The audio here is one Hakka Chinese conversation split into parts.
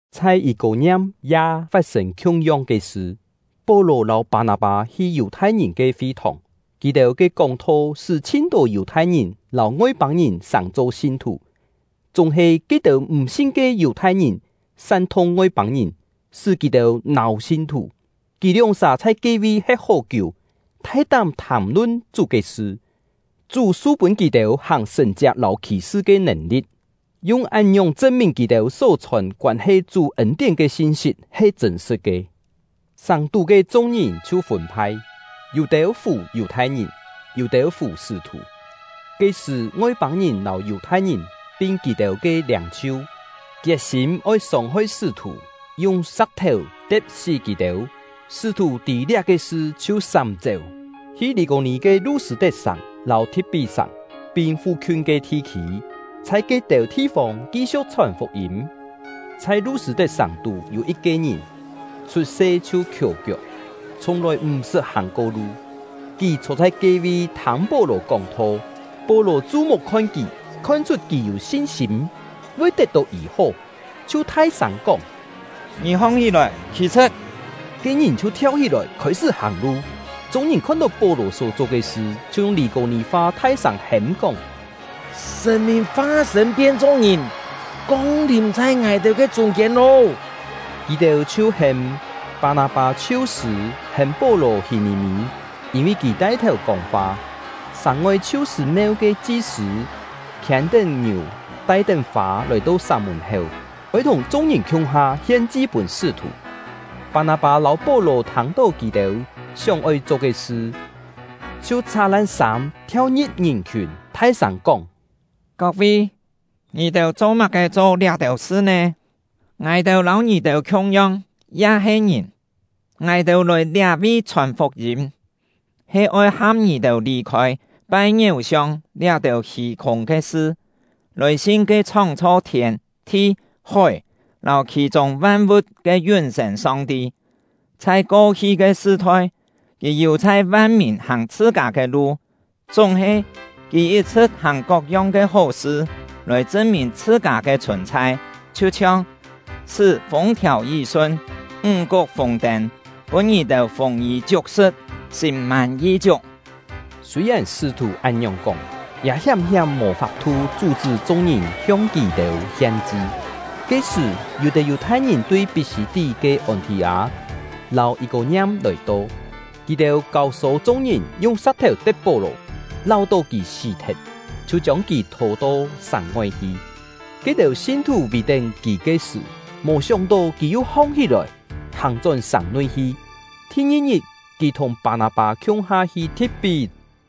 Chhai Yî-kô-ngiam ya fat-sên khiung-yong ke sṳ. Pó-lò lâu Pâ-nâ-pâ hi Yù-thai-ngìn ke fi-thòng; kì-têu ke kóng-tho sṳ́ chhin-tô Yù-thai-ngìn lâu Ngoi-pâng-ngìn sàng-cho sin-thù. Chúng-he ke-têu m̀ sin ke Yù-thai-ngìn san-thung Ngoi-pâng-ngìn, sṳ́ kì-têu nâu sin-thù. Kì lióng-sà chhai ke-vi he̍t hó-kiú, thai-tám thàm-lun Chú ke sṳ. Chú su pûn kì-têu hàng sṳ̀n-chiak lâu khì-sṳ ke nèn-li̍t, yung án-ngiòng chṳn-mìn kì-têu só chhòn koân-he Chú ên-tién ke sin-sit he chṳ̂n-sṳ̍t ke. Sàng-tú ke chung-ngìn chhiu fûn-phai, yû-têu fù Yù-thai-ngìn, yû-têu fù sṳ́-thù. Ke-sṳ̀, Ngoi-pâng-ngìn lâu Yù-thai-ngìn pin kì-têu ke liâng-chhiu kiet-sîm oi sông-hoi sṳ́-thù, yung sa̍k-thèu te̍p-sí kì-têu. Sṳ́-thù tî liá-ke sṳ chhiu sám-chéu, hi Lî-kô-nì ke Lu-sṳ̂-tet-sàng lâu Thi̍t-pí-sàng, pin fu-khiun ke thi-khî, chhai ke-têu thi-fông ki-siu̍k chhòn fuk-yîm. Chhai Lu-sṳ̂-tet sàng-tú yû yit-ke ngìn, chhut-se chhiu khiò-kiok, chhiùng-lòi m̀-sṳt hàng-ko lu. Kì chhô chhai ke-vi thâng Pó-lò kóng-tho. Pó-lò chu-muk khon kì, khon-chhut kì yû sin-sîm, voi tet-tó yî-hó, chhiu thai-sâng kóng: “Ngì hong-hí-lòi, khî-chhṳ̍t!” Ke ngìn chhiu thiau-hí-lòi, khôi-sṳ́ hàng-lu. Chung-ngìn khon-tó Pó-lò só-cho ke sṳ, chhiu yung Lî-kô-nì-fa thai-sâng hêm-kóng: “Sṳ̀n-mìn fa-sṳ̂n pien-cho ngìn, kong-lìm chhai ngài-têu ke chûng-kiên lô!” Kì-têu chhiu hêm Pâ-nâ-pâ “Chhiu-sṳ̂”, hêm Pó-lò “Hî-ngí-mí”, yîn-vi kì tai-thèu kóng-fa. Sàng-ngoi Chhiu-sṳ̂-meu ke chi-sṳ̂ khiên-tén ngiù, tai-tén fâ, lòi-to sàng mùn-héu, oi thùng chung-ngìn khiung-ha hien-chi pûn sṳ́-thù. Pâ-nâ-pâ lâu Pó-lò thâng-tó kì-têu sióng-oi cho ke sṳ, chhiu chhá-lan sâm, thiau-ngi̍p ngìn-khiùn, thai-sâng kóng: “Kok-vi, ngì-têu cho-má-ke cho liá-têu sṳ nè? Ngài-têu lâu ngì-têu khiung-yong, ya he ngìn! Ngài-têu lòi liá-vi chhòn fuk-yîm, he oi ham ngì-têu lì-khôi pai ngiéu-siong liá-têu hî-khûng ke sṳ, lòi sin ke chhóng-chho thiên, thi, hói, lâu khì-chûng van-vu̍t ke yún-sên Song-ti. Chhai ko-hi ke sṳ-thoi, Kì yù-chhai van-mìn hàng chhṳ-kâ ke lu; chúng-he, Kì yit-chhṳ̍t hàng kok-yong ke hó-sṳ lòi chṳn-mìn chhṳ-kâ ke chhùn-chhai, chhiu-chhiong: Sṳ́ fûng-thiàu yí-sun, ńg-kuk fûng-tên, pûn ngì-têu fûng-yî chiuk-sṳ̍t, sîm-mân yi-chiuk.” Sûi-yèn sṳ́-thù án-ngiòng kóng, ya hiám-hiám mò fap-thu chú-chṳ́ chung-ngìn hiong kì-têu hien-chi. Ke-sṳ̀, yû-têu Yù-thai-ngìn tui Pí-sî-tí ke Ôn-thì-â lâu Yî-kô-ngiam lòi-to; kì-têu kâu-sô chung-ngìn yung sa̍k-thèu te̍p Pó-lò, láu-tó kì sí-thet, chhiu chiông kì thô-to sàng-ngoi hi. Ke-têu sin-thù vì-tén kì ke sṳ̀, mò sióng-tó, kì yu hong-hí-lòi, hàng-chón sàng-nui hi. Thi-ngi-ngit, kì thùng Pâ-nâ-pâ khiung-ha hi Thi̍t-pí.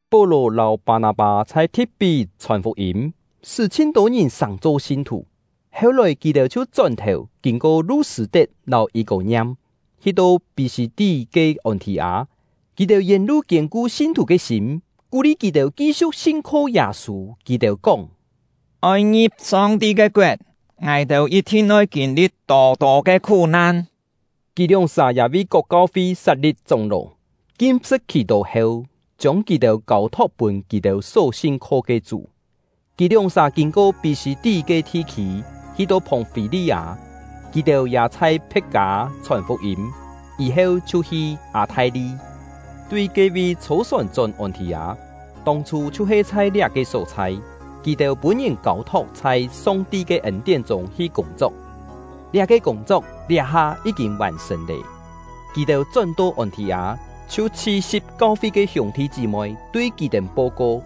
Pó-lò lâu Pâ-nâ-pâ chhai Thi̍t-pí chhòn fuk-yîm, sṳ́ chhin-tô ngìn sàng-cho sin-thù. Heu-lòi, kì-têu chhiu chón-thèu, kîn-ko Lu-sṳ̂-tet lâu Yî-kô-ngiam, hi-to Pí-sî-tí ke Ôn-thì-â. Kì-têu yèn-lu kiên-ku sin-thù ke sîm, kú-li kì-têu ki-siu̍k sin-kho Yâ-sû. Kì-têu kóng: “Oi ngi̍p Song-ti ke koet, ngài-têu yit-thin oi kîn-li̍t tô-tô ke khú-nan.” Kì lióng-sà ya vi kok kau-fi sat-li̍p chóng-ló, kim-sṳ̍t khì-tó heu, chiông kì-têu kâu-thok pûn kì-têu só sin-kho ke Chú. Kì lióng-sà kîn-ko Pí-sî-tí ke thi-khî, hi-to Phòng-fî-li-â. Kì-têu ya chhai Phe̍t-kâ chhòn fuk-yîm, yî-heu chhiu hi Â-thai-li, tui ke-vi chhô-sòn chón Ôn-thì-â. Tông-chhû, chhiu-he chhai liá-ke só-chhai, kì-têu pûn-ngìn kâu-thok chhai Song-ti ke ên-tién chûng hi kûng-chok; liá-ke kûng-chok liá-ha yí-kîn vàn-sṳ̀n lé. Kì-têu chón-to Ôn-thì-â, chhiu chhi-si̍p kau-fi ke hiûng-thi chí-moi, tui kì-têu po-ko,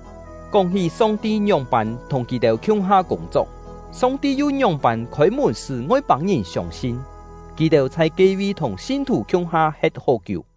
kóng-hí Song-ti ngióng-pân thùng kì-têu khiung-ha kûng-chok, Song-ti yu ngióng-pân khôi-mùn sṳ́ Ngoi-pâng-ngìn siông-sin. Kì-têu chhai ke-vi thùng sin-thù khiung-ha he̍t hó-kiú.